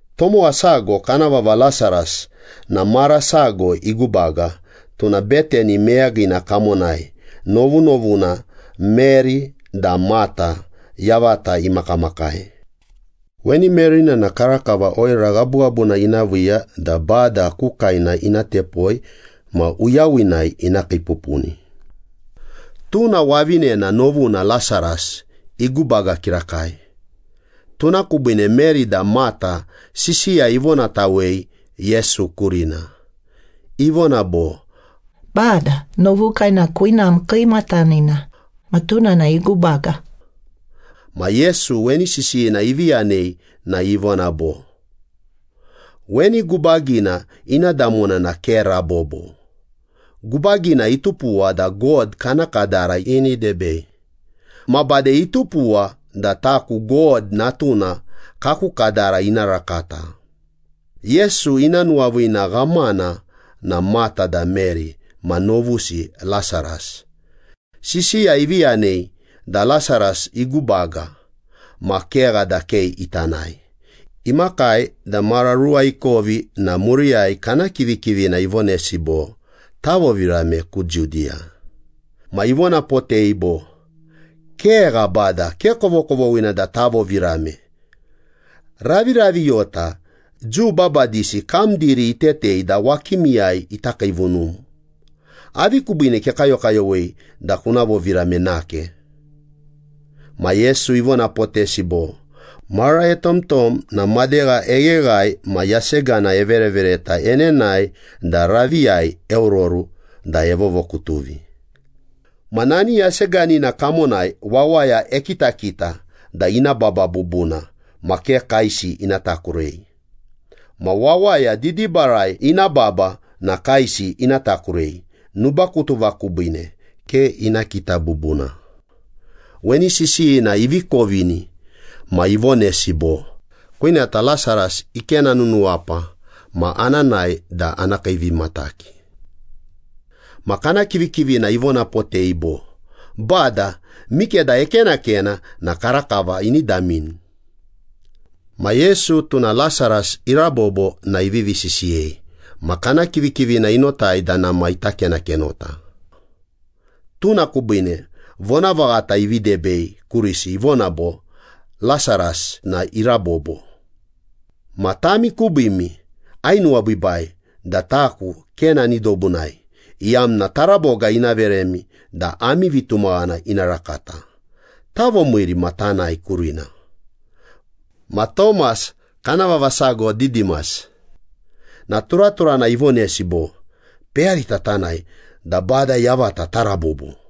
Tomowa sago kana vava Lasaras na mara sago igubaga. Tuna Betani meyagina kamonai novunovuna Meri da Mata yavata imakamakai. Weni Meri na karakava oira ghabughabuna ina viiya da Bada ku kaena ina tepoi ma uyawinai ina kiipupuni. Tuna wavinena novuna Lasaras igubaga kirakai. Tuna kubiine Meri da Mata sisiya ivonatawei Yesu kurina. Ivona bo, “Bada, novukai na kwinam kiimatanina. Ma tuna na igubaga.” Ma Yesu weni sisiyina ivi yanei na ivona bo, “Weni gubagina ina damona na ke rabobo. Gubagina itupuwa da God kana kadara ini debei. Ma bade itupuwa da taku God Natuna kaku kadara ina rakata.” Yesu ina nuwaviina ghamana na Mata da Meri ma novusi Lasaras. Sisiya ivi yanei da Lasaras igubaga, ma kegha da ke ita nae. Imakai da mara ruwa ikovi na muriyai kana kivikivina ivonesi bo, “Tavovirame ku Judiya.” Ma ivonapotei bo, “Kegha Bada, ke kovokovoghina da tavovirame. Raviraviyota Jiu babadisi kam diri itetei da wakimiyai ita kiivunum. Avi kubiine kekayokayowei da kuna vovirame nake?” Ma Yesu ivonapotesi bo, “Mara etomtom na madegha egheghae ma yasegana everevereta enenae da raviyai eororu da evovokutuvi. Ma nani yaseganina kamonai wawaya ekitakita da ina baba bubuna ma ke kaesi ina takurei. Ma wawaya didibarai ina baba na kaesi ina takurei, nubakutuva kubiine ke ina kita bubuna.” Weni sisiyina ivi kovini ma ivonesi bo, “Kwinata Lasaras ikenanunuwapa, ma ana nae da ana kiivimataki.” Ma kana kivikivina ivonapotei bo, “Bada, mikeda ekenakena na karakava ini damini.” Ma Yesu, tuna Lasaras irabobo na ivivi sisiyei, ma kana kivikivina inotai da nama ita kenakenota. Tuna kubiine vonavaghata ivi debei kurisi, ivona bo, “Lasaras na irabobo. Ma tami kubiimi ainuwabiibai da taku ke nani dobunai, iyamna taraboga ina veremi da ami vitumaghana ina rakata. Tavomiiri ma tanae kurina.” Ma Tomas, kana vava sago Didimas, na turaturana ivonesi bo, “Peyarita tanae, da Bada yavata tarabobo.”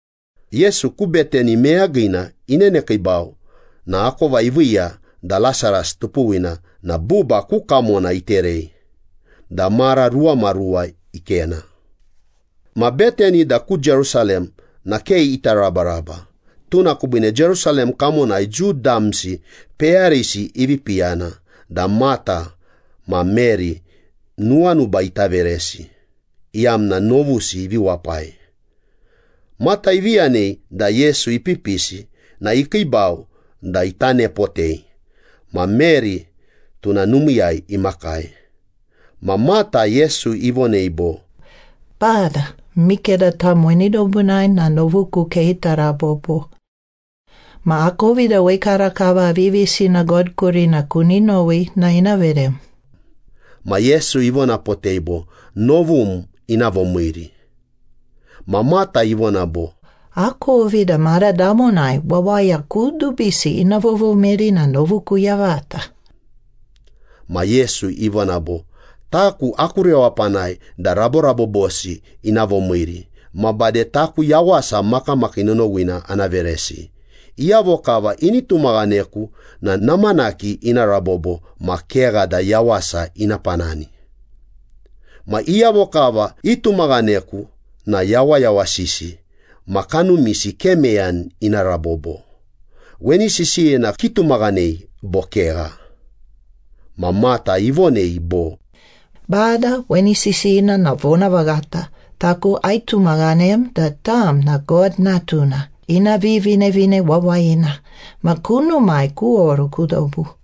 Yesu ku Betani meyagina inenekiibau na akova iviiya da Lasaras tupuwina na buba ku kamona iterei da mara ruwamaruwa ikena. Ma Betani da ku Jerusalem na ke ita rabaraba. Tuna kubiine Jerusalem kamonai Jiu damsi peyarisi ivi piyana da Mata ma Meri nuwanuba ita veresi, iyamna novusi ivi wapai. Mata ivi yanei da Yesu ipipisi na ikiibau da ita nepotei ma Meri tuna numiiyai imakai. Ma Mata, Yesu ivonei bo, “Bada, mikeda tam weni dobunai na novuku ke ita rabobo. Ma akovi da wekarakava aviyavisina God kurina kuni nowi na ina verem.” Ma Yesu ivonapotei bo, “Novum ina vomiiri.” Ma Mata ivona bo, “Akovi da mara damonai wawaya kudubisi ina vovomiiri na novuku yavata.” Ma Yesu ivona bo, “Taku aku rewapanai da raborabobosi ina vomiiri ma bade taku yawasa makamakii nonowina ana veresi. Iyavo kava ini tumaghaneku na namanaki ina rabobo ma kegha da yawasa ina panani. Ma iyavo kava itumaghaneku na yawayawasisi ma kanumisi ke meyani ina rabobo. Weni sisiyina kitumaghanei bo kegha?” Ma Mata ivonei bo, “Bada, weni sisiyina na vonavaghata. Taku aitumaghanem da tam na God Natuna, ina Vivinevine Wawayina. Ma kunumai kuoru ku dobu.”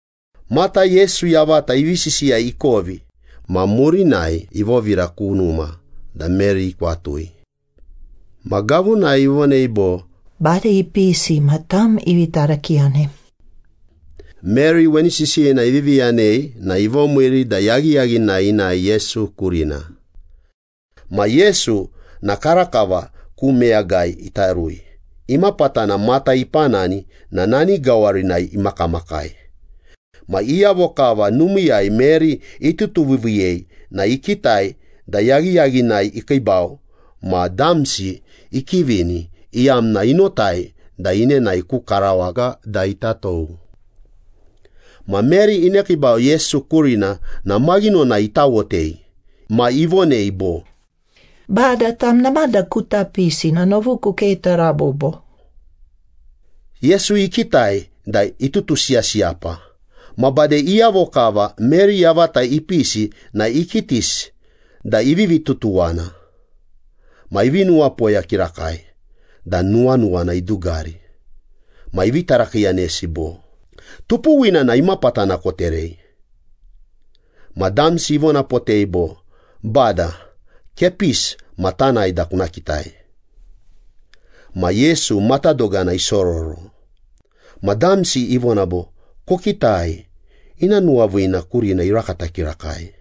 Mata, Yesu yavata ivi sisiya ikovi ma murinai ivovira ku numa da Meri ikwatui. Ma gavunai ivonei bo, “Bada ipisi ma tam ivi tarakiiyanem.” Meri weni sisiyina ivivi yanei na ivomiiri da yaghiyaghinai inae Yesu kurina. Ma Yesu na karakava ku meyagai ita rui, imapatana Mata ipanani na nani gawarinai imakamakai. Ma iyavo kava numiiyai Meri itutuviiviiyei na ikitai da yaghiyaghinai ikiibau ma damsi ikivini, iyamna inotai da inenae ku karawaga da ita tou. Ma Meri inekiibau Yesu kurina na maghinonai itawotei. Ma ivonei bo, “Bada, tam namada kuta pisi na novuku ke ita rabobo.” Yesu ikitai da itutusiyasiyapa ma bade iyavo kava Meri yavata ipisi na ikitisi da ivivi tutuwana. Ma ivi nuwapoya kirakai da nuwanuwana idugari. Ma ivi tarakiiyanesi bo, “Tupuwina na imapatana koterei?” Ma damsi ivonapotei bo, “Bada, kepisi ma tanae da kuna kitai.” Ma Yesu matadogana isororo. Ma damsi ivona bo, “Kokitai, ina nuwaviina kurina irakata kirakai.”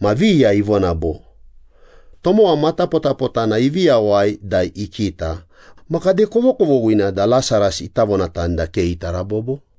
Ma viya ivona bo, “Tomowa matapotapotana ivi yawai da ikita, ma kade kovokovoghina da Lasaras ita vonatani da ke ita rabobo?”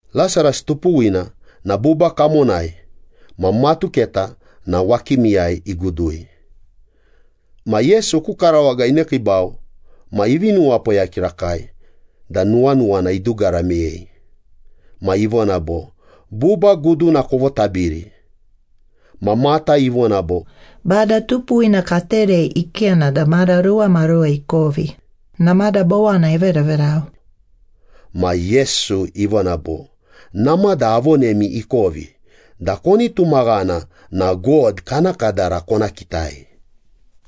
Lasaras tupuwina na buba kamonai ma matuketa na wakimiyai igudui. Ma Yesu ku karawaga inekiibau ma ivi nuwapoya kirakai da nuwanuwana idugara meyei. Ma ivona bo, “Buba guduna kovotabiri.” Ma Mata ivona bo, “Bada tupuwina katerei ikena da mara ruwamaruwa ikovi. Namada bowana everaverau.” Ma Yesu ivona bo, “Namada avonemi ikovi da koni tumaghana na God kana kadara kona kitai.”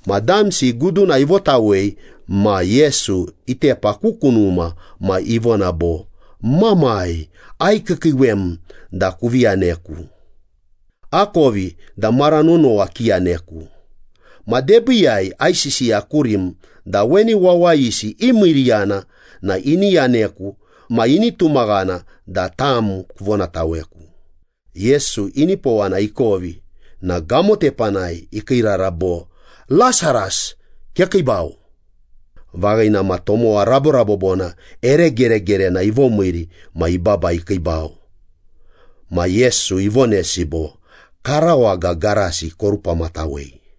Ma damsi guduna ivotawei ma Yesu itepa ku kunuma ma ivona bo, “Mamai, aikiikiiwem da kuvi yaneku. Akovi da mara nonowa kiyaneku. Ma debiiyai aisisiya kurim da weni wawayisi imiiriyana na ini yaneku ma ini tumaghana da tam kuvonataweku.” Yesu inipowana ikovi na gamo tepanai ikiirara bo, “Lasaras, kekiibau.” Vaghina ma tomowa raborabobona ere geregerena ivomiiri ma ibaba ikiibau. Ma Yesu ivonesi bo, “Karawaga garasi korupamatawei.”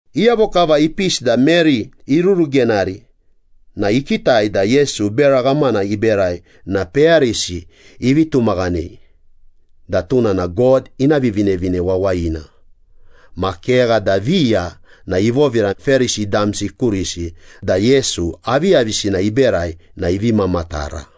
Iyavo kava ipisi da Meri irurugenari na ikitai da Yesu bera ghamana iberai na peyarisi ivi tumaghanei da tuna na God ina Vivinevine Wawayina. Ma kegha da viya na ivovira Perisi damsi kurisi da Yesu aviyavisina iberai na ivi mamatara.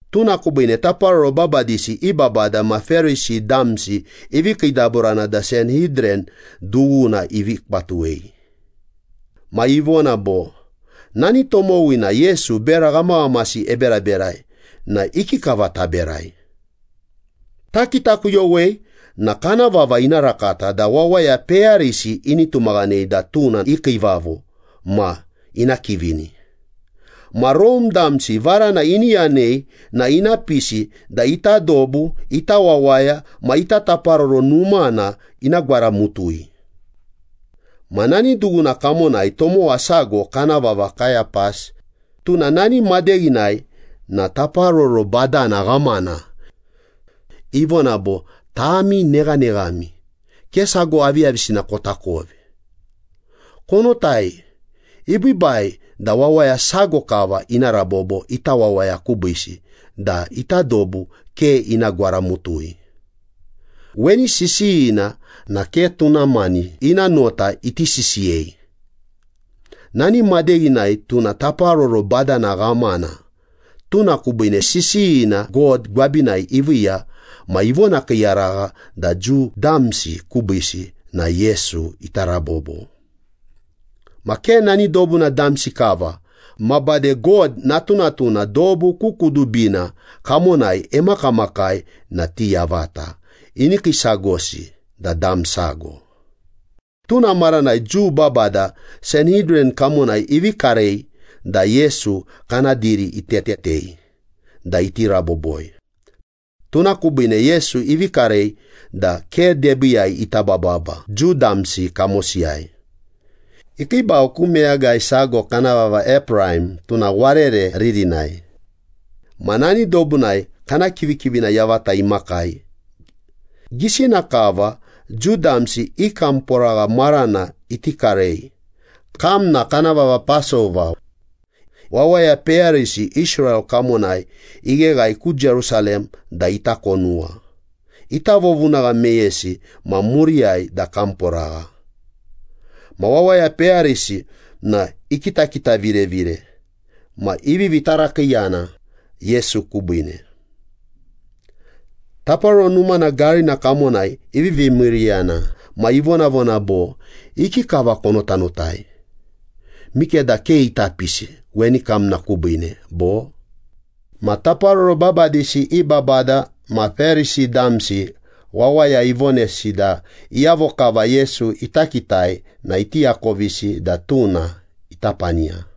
Tuna kubiine taparoro babadisi i babada ma Perisi damsi ivi kiidaburana da Sanhidran dughuna ivi kwatuwei. Ma ivona bo, “Nani tomowina Yesu bera ghamaghamasi eberaberai na ikikava taberai? Takitakuyowei na kana vava ina rakata da wawaya peyarisi ini tumaghanei da tuna i kiivavo ma ina kivini. Ma Rome damsi varana ini yanei na ina pisi da ita dobu, ita wawaya ma ita Taparoro Numana ina gwaramutui.” Ma nani dughuna kamonai tomowa sago kana vava Kayapas, tuna nani madeghinai na taparoro badana ghamana. Ivona bo, “Tami neghaneghami. Ke sago aviyavisina kotakovi. Konotai, ibiibai da wawaya sago kava ina rabobo ita wawaya kubiisi da ita dobu ke ina gwaramutui.” Weni sisiyina na ke tuna mani ina nota iti sisiyei. Nani madeghinai tuna taparoro badana ghamana, tuna kubiine sisiyina God gwabinai iviiya ma ivonakiiyaragha da Jiu damsi kubiisi na Yesu ita rabobo. Ma ke nani dobuna damsi kava ma bade God natunatuna dobu ku kudubina kamonai emakamakai na ti yavata ini kiisagosi da dam sago. Tuna maranai Jiu babada Sanhidran kamonai ivi karei da Yesu kana diri itetetei da iti raboboi. Tuna kubiine Yesu ivi karei da ke debiiyai ita bababa Jiu damsi kamosiyai. Ikiibau ku meyagai sago kana vava Epraim, tuna warere ririnai. Ma nani dobunai kana kivikivina yavata imakai. Gisina kava Jiu damsi i kamporagha marana iti karei, kamna kana vava Pasova, wawaya peyarisi Israel kamonai igheghae ku Jerusalem da ita konuwa, ita vovunagha meyesi ma muriyai da kamporagha. Ma wawaya peyarisi na ikitakitavirevire ma ivivi tarakiiyana Yesu kubiine. Taparoro Numana garina kamonai ivivi miiriyana ma ivonavona bo, “Ikikava konotanotai? Mikeda ke ita pisi weni kamna kubiine bo?” Ma taparoro babadisi i babada ma Perisi damsi wawaya ivonesi da iyavo kava Yesu ita kitai na iti akovisi da tuna ita paniya.